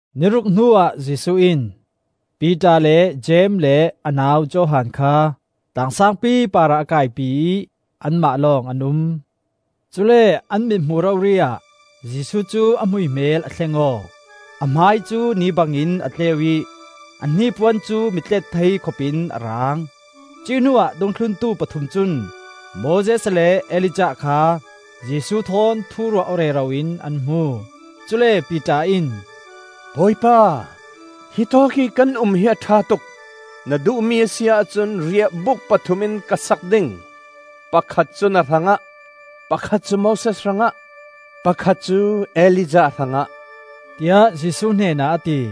Ni ruk hnuah Jesuh in Piter le Jeim le a nau Johan kha tlang saangpi parah a kaipi ih anmah lawng an um. Cule an mithmuh rori ah Jesuh cu a hmuihmel a thleng aw; a hmai cu ni bangin a tleu ih a hnipuan cu mi tlet thei khopin a raang. Cuih hnuah dungthluntu pathum cun Moses le Elijah kha Jesuh thawn thu ruah aw rero in an hmu. Cule Piter in, “Bawipa, hitawk ih kan um hi a ṭha tuk; na duhmi a si ahcun riahbuk pathum in ka sak ding; pakhat cu na hrangah, pakhat cu Moses hrangah, pakhat cu Elijah hrangah,” tiah Jesuh hnenah a ti.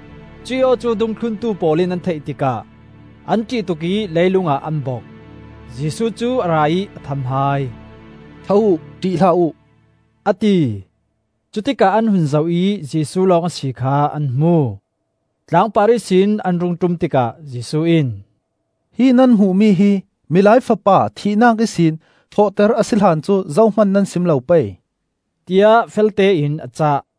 Cuih aw cu dungthluntu pawl in an theih tikah an ṭih tuk ih leilung ah an bok. Jesuh cu a ra ih a tham hai. “Tho uh, ṭih hlah uh,” a ti. Cutikah an hun zoh ih Jesuh lawng a si kha an hmu. Tlangpar ihsin an rung ṭum tikah Jesuh in, “Hi nan hmuhmi hi Milai Fapa thihnak ihsin thawhter a si hlan cu zohman nan sim lo pei,” tiah feltein a cah.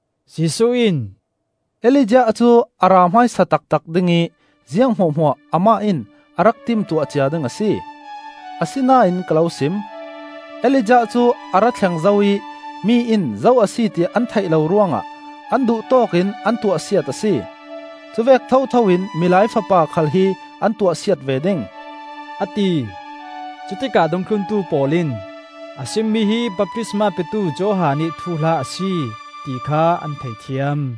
Jesuh in, “Elijah cu a ra hmaisa taktak ding ih ziang hmuahhmuah amah in a rak timtuah cia ding a si. Asinain ka lo sim: Elijah cu a ra thleng zo ih mi in zo a si ti an theih lo ruangah an duhtawk in an tuahsiat a si. Cuvek thotho in Milai Fapa khal hi an tuahsiat ve ding,” a ti. Cutikah dungthluntu pawl in a simmi hi baptisma petu Johan ih thuhla a si, ti kha an thei thiam.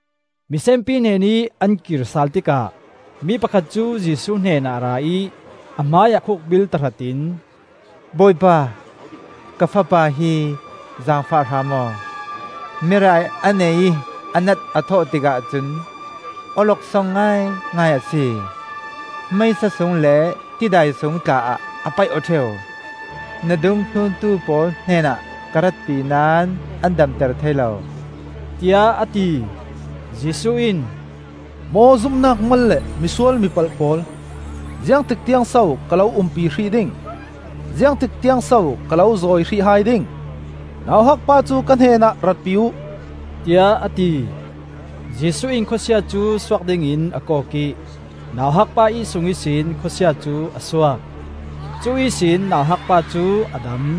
Misenpi hnenih an kir sal tikah mi pakhat cu Jesuh hnenah a ra ih a hmaiah khukbil tahratin, “Bawipa, ka fapa hi zaangfah hram aw. Merai a nei ih a nat a thawh tikah cun awloksong ngaingai a si; meisa sung le tidai sung tla ah a paih aw ṭheu. Na dungthluntu pawl hnenah ka ratpi naón an damter thei lo,” tiah a ti. Jesuh in, “Maw zumnak mal le misual mipalh pawl! Ziangtik tiangso ka lo umpi hrih ding? Ziangtik tiangso ka lo zawi hrih hai ding? Nauhak pa cu ka hnenah ratpi uh,” tiah a ti. Jesuh in khawsia cu suak dingin a kawk ih nauhakpa ih sung ihsin khawsia cu a suak; cu ihsin nauhak pa cu a dam.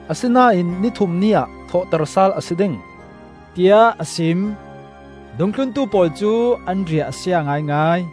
Asinain ni thum ni ah thawhter sal a si ding,” tiah a sim. Dungthluntu pawl cu an riah a sia ngaingai.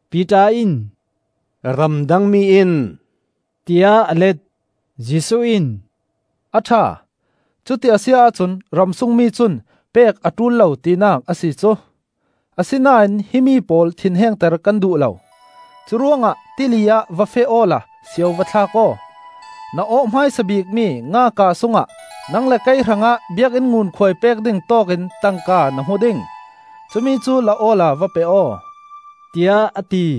Piter in, “Ramdang mi in,” tiah a let. Jesuh in, “A ṭha, cuti a si ahcun ramsung mi cun pek a ṭul lo tinak a si cu! Asinain hi mi pawl thinhengter kan duh lo. Curuangah tili ah va feh awla sio va thlak aw. Na awh hmaisa bikmi nga kaa sungah nang le kei hrangah biakinn ngunkhuai pek ding tawkin tangka na hmu ding. Cumi cu la awla va pe aw,” tiah a ti.